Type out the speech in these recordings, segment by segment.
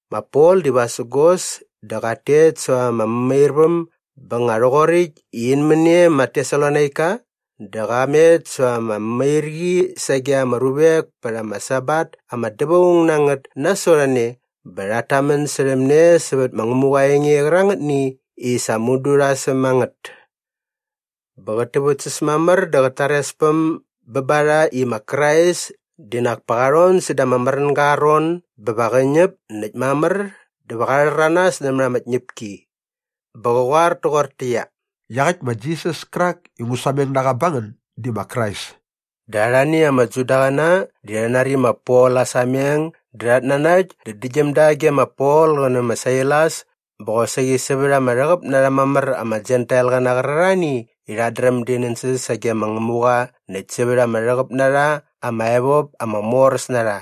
Ma Pol di vasägos dä qat tet säva ama mämairväm bä nga rhoqoräkt i in män e ma Tesalonaika dä qa met säva ama mämairqi sage ama ruvek pät ama Sabat ama dävaung na ngät nasot a ne bä rhat tamän särhäm ne sävät ma Ngämuqa aa enge qärangätni i sa mudu rha säm a ngät. Bä qät täväktsäs mamär dä qat tarespäm bä ba rha i ma Krais di nak pa qa rhon säda ama märänga aa ron bä va qä ñäp näkt mamär dä va qa rhäranas nämät ama tñäpki. Bä qä qoar toqortäqyia, “Iaqäkt ma Jisas kärak i ngu sameng na qa ba ngän di ma Krais.” Dä arhani ama Judaqäna di rha nari ma Pol aa sameng dä rhat nanakt dä däktgyäm da ge ma Pol qä nä ma Sailas bä qosaqi sävät ama rhäqäp na rha mamär ama Jentailqäna qärarhani i rhat dräm di nänsäs sage ma Ngämuqa näkt sävät ama rhäqäp na rha ama evop ama moräs na rha.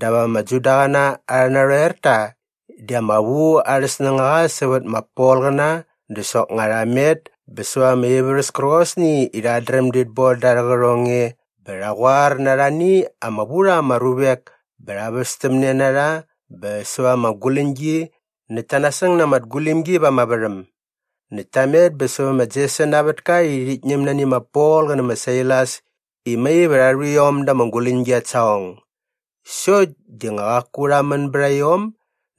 Dap ama Judaqäna arhä narhoerta di ama vu arhä snängaqa sävät ma Polqäna dä soknga rha met bä säva ama ivärhäs kärqosni i rhat dräm dit boda arhä qärhong e bä rha qoar na arhani ama vu rha ama ruvek bä rha västämne na rha bä säva ama guläñgi näkt ta nasäng na ama tgulimgi va ama värhäm. Näkt ta met bä sävä ma Jeson aa vätka i rhit ñäm nani ma Pol qä nä ma Sailas i mai va rha rhu iom da ama guläñgi at saqong. Sokt di nga qaku rha män bät a iom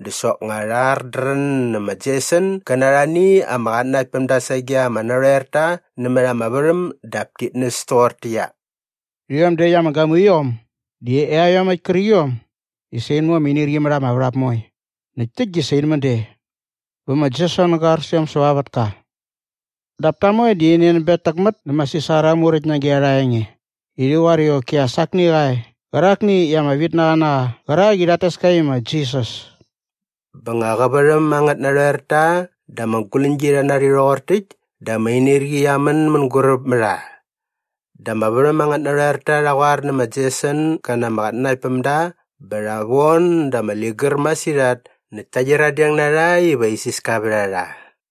dä soknga rha ardrän nä ma Jeson gä na arhani ama qatnanaktpämda sage ama narhoerta nämät ama värhäm dap tit näs toqortäqyia, “Rhiom däkt ama gamuiom di iaiomäkt kärqiom i sa in mu ama inirqi mät ama värhap moe näkt täkt di sa in män de. Bä ma Jeson ga ar sä iom säva aa vätka. Dap ta moe di rhi nänbetäkmät nä ma Sisar aa muräkt nage arha enge i rhi qoar i qoki as akni qa e qärakni i ama vitnaqa na qa qärak i rhat tes ka i ma Jisas.” Bä nga qä värhäm angät narhoerta dä ama guläñgi rha nari rhoqor täkt dä ama inirqi qia män mänguräp mä rha. Dä ama värhäm angät narhoerta rha qoar nä ma Jeson gä na ama qatnanaktpämda bä rha von da ama ligär masirhat näkt ta qyiradeng na rha iva isiska vät a rha.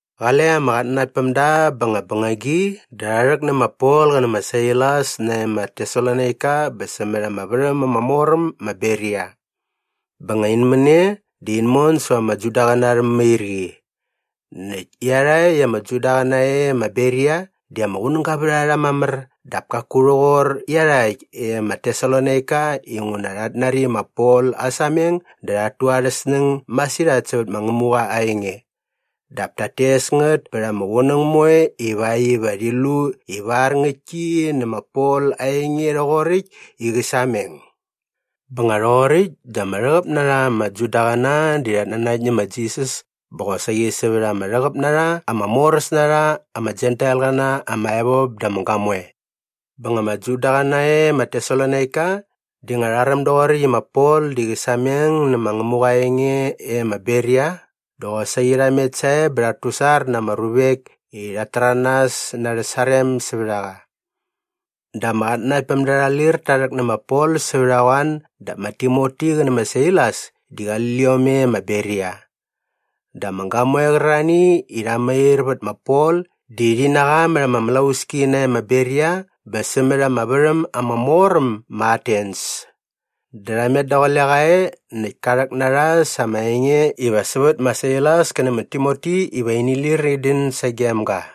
Qale ama qatnanaktpämda bä nga bängagi dä rha rhäk nä ma Pol qä nä ma Sailas nae ma Tesalonaika bä sämät ama värhäm ama mor äm ma Beria. Bä nga in män e dä in mon säva ama Judaqäna arhä mämairqi. Näkt iarhakt ama Judaqäna e ma Beria di ama qunäga vät a rha mamär dap kaku rhoqor iarhakt e ma Tesalonaika inguna rhat nari ma Pol aa sameng dä rhat tu arhä snäng masirhat sävät ma Ngämuqa aa enge. Dap tat tes ngät pät ama qunäng moe ivakt iva rhi lu ivar ngäktki nä ma Pol aa enge rhoqoräkt i qä sameng. Bä nga rhoqoräkt dä ama rhäqäp na rha ama Judaqäna di rhat nanakt nä ma Jisas bä qosaqi sävät ama rhäqäp na rha ama moräs na rha ama Jentailqäna ama evop dä ama gamoe. Bä nga ama Judaqäna e ma Tesalonaika di nga rha räm doqoräkt i ma Pol di qä sameng nä ma Ngämuqa aa enge e ma Beria dä qosaqi rha met sae bä rhat tusar na ama ruvek i rhat täranas na arhä sarem sävät a qa. Dä ama qatnanaktpämda rha lir ta rhäk nä ma Pol sävät a qoan dap ma Timoti qä nä ma Sailas di qali liom e ma Beria. Dä ama gamoe qärarhani i rha mair vät ma Pol di rhi na qa mät ama mlauski nae ma Beria bä sämät ama värhäm ama mor äm ma Atens. Dä rha met daqule qa e näkt ka rhäk na rha sa ama enge iva sävät ma Sailas kä nä ma Timoti iva ini lir in dän sagem ga.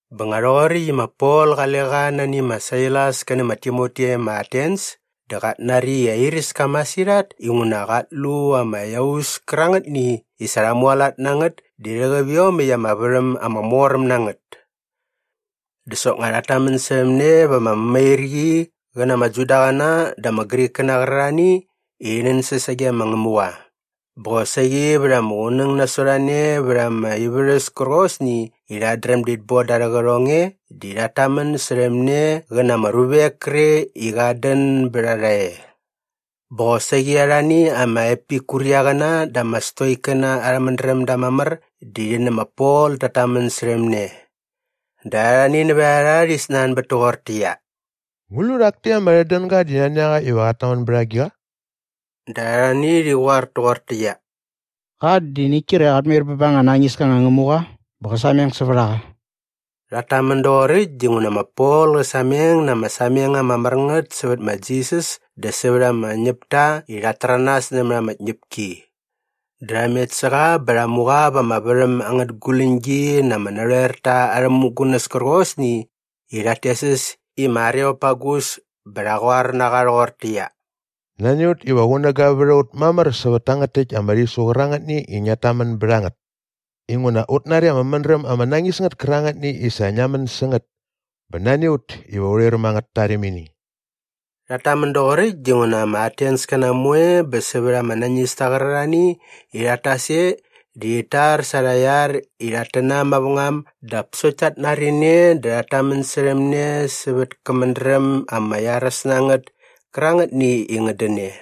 Bä nga rhoqoräkt i ma Pol qale qa nani ma Sailas kä nä ma Timoti e ma Atens dä qat nari i airäs ka masirhat inguna qat lu ama iaus kärangätni i sa rha mualat na ngät di rhäqäp iomäkt ama värhäm ama mor äm na ngät. Dä soknga rhat tamän särhäm ne va ama mämairqi qä na ama Judaqäna dä ama Grikkäna qärarhani i rhi nänsäs sage ma Ngämuqa. Bä qosaqi vät ama qunäng nasot a ne vät ama ivärhäs kärqosni i rhat dräm dit boda arhä qärhong e di rhat tamän särhäm ne qä na ama ruvek kre i qat dän bät a rha e. Bä qosaqi arhani ama Epikuriangäna dä ama Stoikkäna arhä mädrämda mamär di rhi nä ma Pol tat tamän särhäm ne. Dä arhani nävät a rha rhi snanbät toqortäqyia, “Ngu lu rhak takt ama dädänga di nani a qa iva qat tamän bät agiqa?” Dä arhani rhi qoar toqortäqyia, “Qa di ngäkt kre qat mair bä ba anga nañis ka anga ngämuqa bä qä sameng sävät a qa.” Rhat tamän doqoräkt dinguna ma Pol qä sameng na ama sameng ama mär ngät sävät ma Jisas dä sävät ama ñäpta i rhat täranas nämät ama tñäpki. Dä rha met sä qa bä rha mu qa va ama värhäm angät guläñgi na ama narhoerta arhä mämugunäs kärqosni i rhat tes äs i ma Areopagus bä rha qoar na qa rhoqortäqyia, “Nani a ut iva qunäga vät a ut mamär sävät tangät täkt ama rhisu qärangätni i ngiat tamän bät a ngät inguna ut nari ama mädräm ama nañis ngät kärangätni i sa ngia män sä ngät bä nani a ut iva urhi räm angät tarimini.” Rhat tamän doqoräkt dinguna ama Atenskäna moe bä sävät ama nañista qärarhani i rhat tas e di rhit tar sa arha iar i rhat tänam mavängam dap sokt tat nari ne dä rhat tamän särhäm ne sävät kä mädräm ama iaräs na ngät kärangätni i ngät dän e.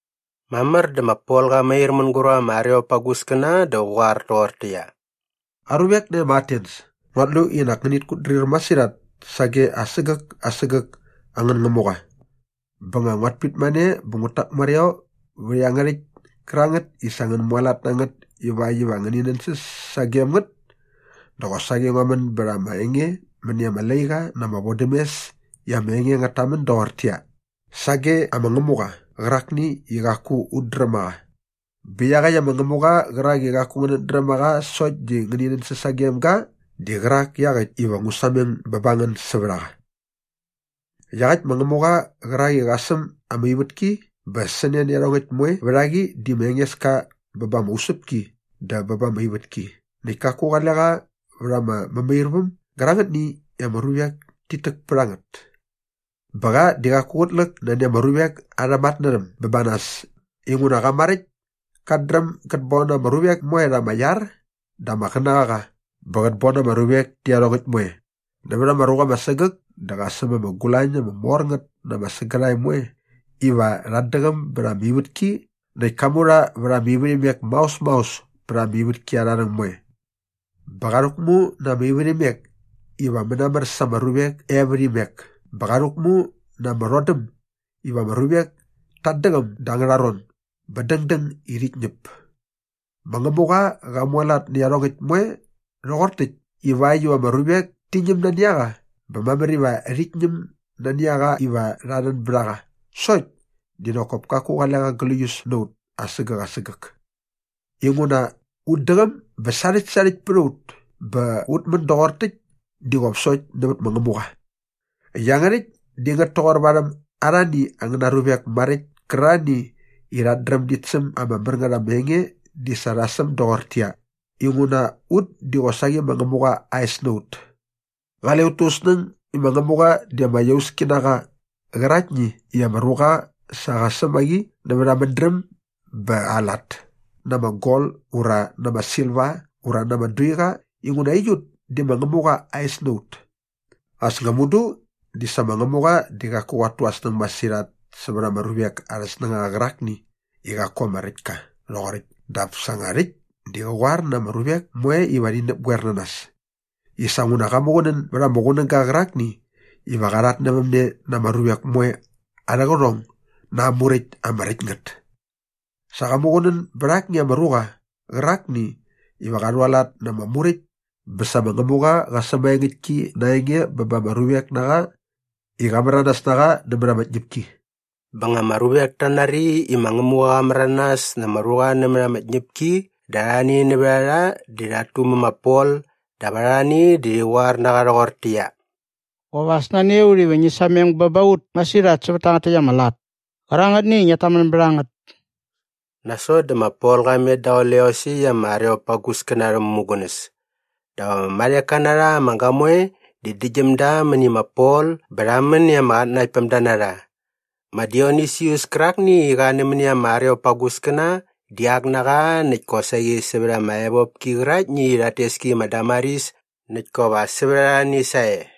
Mamär dä ma Pol qa mair mänguräp ama Areopaguskäna dä qä qoar toqortäqyia, “Aruvek nae ma Atens, nguat lu i nak ngänit kutdrir masirhat sage asägäk asägäk angän ngämuqa. Bä nga nguat pitmane bä ngut täkmareo vät iangärhäkt kärangät i sa ngän mualat na ngät ivakt iva ngäni nänsäs sagem ngät dä qosaqi ngua män bät ama enge mäni ama laiqa na ama vodämes i ama enge ngät tamän doqortäqyia, ‘Sage ama ngämuqa qärakni i qaku ut dräm a qa.’ Bä iaqäkt ama ngämuqa qärak i qaku ngänät dräm a qa sokt di ngäni nänsäs sagem ga di qärak iaqäkt iva ngu sameng bä ba ngän sävät a qa. Iaqäkt ma Ngämuqa qärak i qa säm ama ivätki bä sä ne nä iangärhäkt moe vät a qi di ma Engeska bä ba ama usäpki dä bä ba ama ivätki näkt kaku qale qa va ama mämairväm gärangätni i ama ruvek tit täk pät a ngät. Bä qa di qaku qät läk nani ama ruvek arhä matnärhäm bä ba nas inguna qa maräkt kat dräm gät bon ama ruvek moe rha ama iar dä ama qänäqaqa bä qät bon ama ruvek tä iarhongäkt moe. Nävät ama ruqa ama sägäk dä qa säm ama gulañ ama mor ngät na ama sägärhae moe iva rhat däqäm bät ama ivätki näkt ka mu rha vät ama ivärhimek maos maos pät ama ivätki arha rhäng moe. Bä qa rhäkmu na ama ivärhimek iva mänamär sa ama ruvek e vät imek bä qa rhäkmu na ama rhodäm iva ama ruvek tat däqäm da angärha ron bä dängdäng i rhit ñäp. “Ma Ngämuqa qa mualat nä iarhongäkt moe rhoqor täkt ivakt iva ama ruvek ti ñäm nani a qa bä mamär iva rhit ñäm nani a qa iva rha rhän bät a qa sokt di nak kop kaku qale qa gläius na ut asägäk asägäk inguna “‘Ut däqäm bä sarhäktsarhäkt pät a ut bä ut män doqor täkt di qop sokt nävät ma Ngämuqa.’ Iangärhäkt di ngät toqor varhäm arhani angäna ruvek maräkt kärarhani i rhat dräm dit säm ama mär ngät ama enge di sa rha säm doqortäqyia, “‘Inguna ut di qosaqi ma Ngämuqa aa es na ut.’ Qale ut tu ut snäng i ma Ngämuqa di ama iauski na qa qärakni i ama ruqa sa qa säm a qi nävät aa mädräm bä aa lat na ama gol ura na ama silva ura na ama duiqa inguna aiut di ma Ngämuqa aa es na ut. As nga mudu di sa ma Ngämuqa di qaku qat tu aa snäng masirhat sävät ama ruvek arhä snängaqa qärakni i qaku ama räkt ka rhoqoräkt dap sa nga rhäkt di qä qoar na ama ruvek moe iva rhi näpgoer na nas i sa nguna qa muqunän bät ama qunäga qärakni iva qa rhatnävämne na ama ruvek moe arhä qärhong na aa muräkt ama räkt ngät. Sa qa muqunän bät akni ama ruqa qärakni iva qa rhualat na ama muräkt bä sa ma Ngämuqa qa säm maengäktki na aa enge bä ba ama ruvek na qa i qa märanas na qa nämät ama tñäpki.” Bä nga ama ruvek ta nari i ma Ngämuqa qa märanas na ama ruqa nämät ama tñäpki dä arhani nävät a rha di rhat tumä ma Pol dap arhani di rhi qoar na qa rhoqortäqyia, “Qop as nani a ut iva ngi sameng bä ba ut masirhat sävät tangät täkt ama lat kärangätni i ngiat tamän bät a ngät.” Nasot dä ma Pol qa met daqule iosäkt ama Areopaguskäna arhä mämugunäs. Dap ama marheka na rha ama gamoe di däktgyäm da mäni ma Pol bä rha män i ama qatnanaktpämda na rha. Ma Dionisius kärakni i qa nämäni ama Areopaguskäna di ak na qa näkt kosaqi sävät ama evopki qäraktni i rhat tes ki i ma Damaris näkt kop as sävät arhani sae.